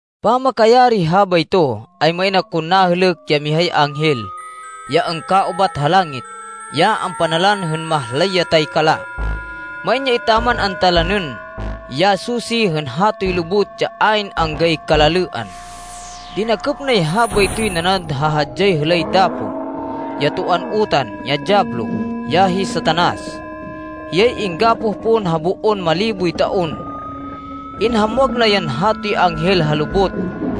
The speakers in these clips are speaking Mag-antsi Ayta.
Pamakayari habayto, ay main akon nahêlêk ya mihay anghel, ya angkaubat ha langit, ya ampanalan hên mahlay ya taykala. Main ya etaman antalanên ya susi hên hatoy lubot ya ayn anggay kalalêan. Dinakêp nay habaytoy nanad ha hadyay hêlay dapo, ya toan utan, ya Diyablo, ya hi Satanas. Hiyay inggapoh pon ha boon maliboy taon. Inhamwag na yan hatoy anghel ha lubot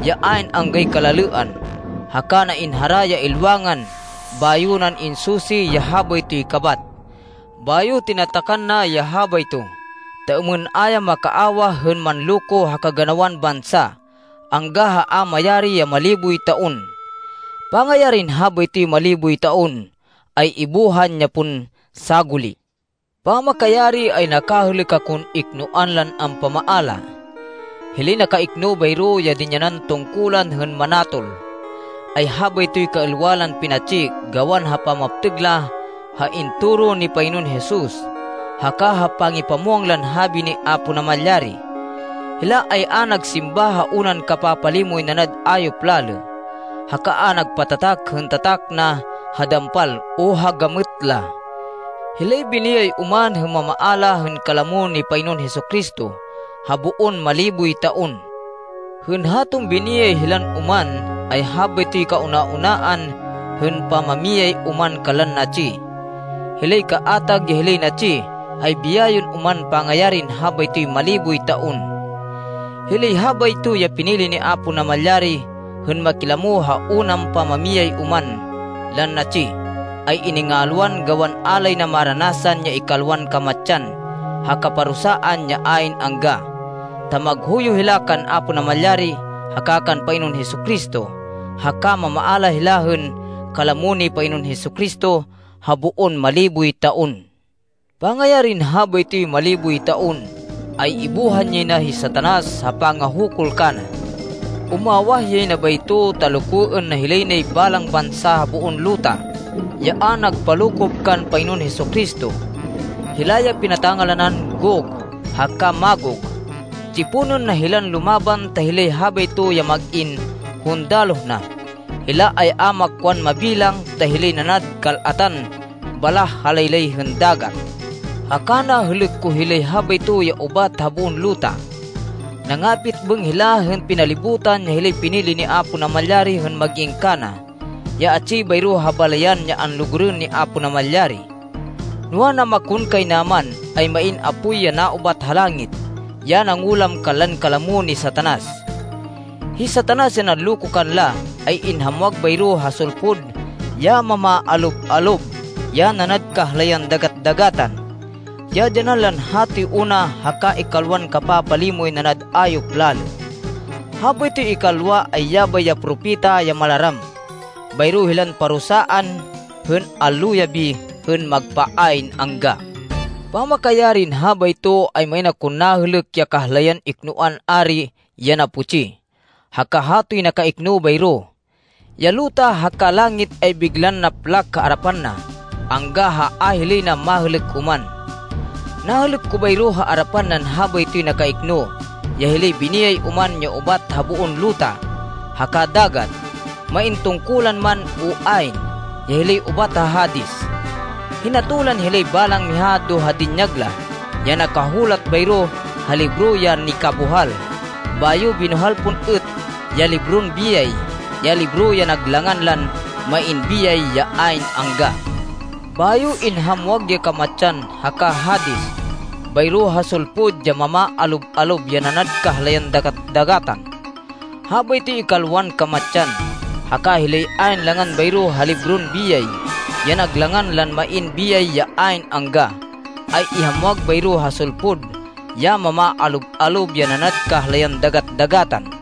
ya ayn anggay kalalêan, haka na inhara ya ilwangan bayo nan insusi ya habaytoy kabat. Bayo na tinatakan ya habayto, ta êmên a ya makaawah hên manloko ha kaganawan bansa, angga ha a mayari ya maliboy taon. Pangayarin habaytoy maliboy taon, ay ibuhan ya pon saguli. Pamakayari, ay nakahêlêk akon iknoan lan ampamaala. Hilay nakaikno bayro, ya dinyanan tungkulan hên manatol, ay habaytoy kaêlwa lan pinatsi gawan ha pamaptêg la ha intoro ni Panginoon Jesus, haka ha pangipamwang lan habi ni Apo Namalyari. Hila ay a nagsimba ha unan kapapalimoy nanad ayop lalê, haka a nagpatatak hên tatak na ha dampal o ha gamêt la. Hilay biniyay oman hên mamaala hên kalamo ni Panginoon Jesu-Cristo ha boon maliboy taon. Hên haton biniyay hilan oman, ay habaytoy kauna-unaan hên pamamiyay oman kanlan natsi. Hilay kaatag ya hilay natsi ay biyayên oman pangayarin habaytoy maliboy taon. Hilay habayto ya pinili ni Apo Namalyari hên makilamo ha unan pamamiyay oman lan natsi, ay iningalwan gawan a lay na maranasan ya ikalwan kamatsan ha kaparusaan ya ayn angga, ta maghuyo hila kan Apo Namalyari haka kan Panginoon Jesu-Cristo, haka mamaala hila hên kalamo ni Panginoon Jesu-Cristo ha boon maliboy taon. Pangayarin habaytoy maliboy taon, ay ibuhan yay na hi Satanas ha pangahukul kana. Umawah yay na bayto ta lokoên na hilay nay balang bansa ha boon luta, ya a nagpalokop kan Panginoon Jesu-Cristo. Hila ya pinata-ngalanan Gog haka Magog. Tsiponên na hilan lumaban ta hilay habayto ya mag-in hundaloh na. Hila ay a makwan mabilang ta hilay nanad kal-atan baláh ha laylay hên dagat. Haka nahêlêk ko hilay habayto ya ubat ha boon luta. Nangapitbêng hila hên pinalibutan ya hilay pinili ni Apo Namalyari hên mag-in kana ya atsi bayro ha balayan ya anlugurên ni Apo Namalyari. Noa, namakonkaynaman, ay main apoy ya naubat ha langit ya nangulam kanlan kalamo ni Satanas. Hi Satanas ya nanloko kanla, ay inhamwag bayro ha sulpud ya mamaalob-alob ya nanad kahlayan dagat-dagatan, ya dyanan lan hatoy una haka ikalwan kapapalimoy nanad ayop lalê. Habaytoy ikalwa, ay yabay ya propeta ya malaram. Bayro hilan parusaan hên allo yabi, hên magpa ayn angga. Pamakayarin habayto, ay main akon nahêlêk ya kahlayan iknoan ari ya naputsi, haka hatoy nakaikno bayro. Ya luta haka langit ay biglan naplak ha arapan na, angga ha a hilay na mahêlêk oman. Nahêlêk ko bayro ha arapan nan habaytoy nakaikno ya hilay biniyay oman ya ubat ha boon luta haka dagat, main tungkulan man o ayn, ya hilay ubat ha Hades. Hinatolan hilay balang miha do ha dinyag la, ya nakahulat bayro ha libro ya nikabuhal. Bayo binuhal pon êt ya libron biyay, ya libro ya nag langan lan main biyay ya ayn angga. Bayo inhamwag ya Kamatsan haka Hades bayro ha sulpud ya mamaalob-alob ya nanad kahlayan dagat-dagatan. Habaytoy ikalwan kamatsan, haka hilay ayn langan bayro ha libron biyay, ya nag langan lan main biyay ya ayn angga, ay ihamwag bayro ha sulpud ya mamaalob-alob ya nanad kahlayan dagat-dagatan.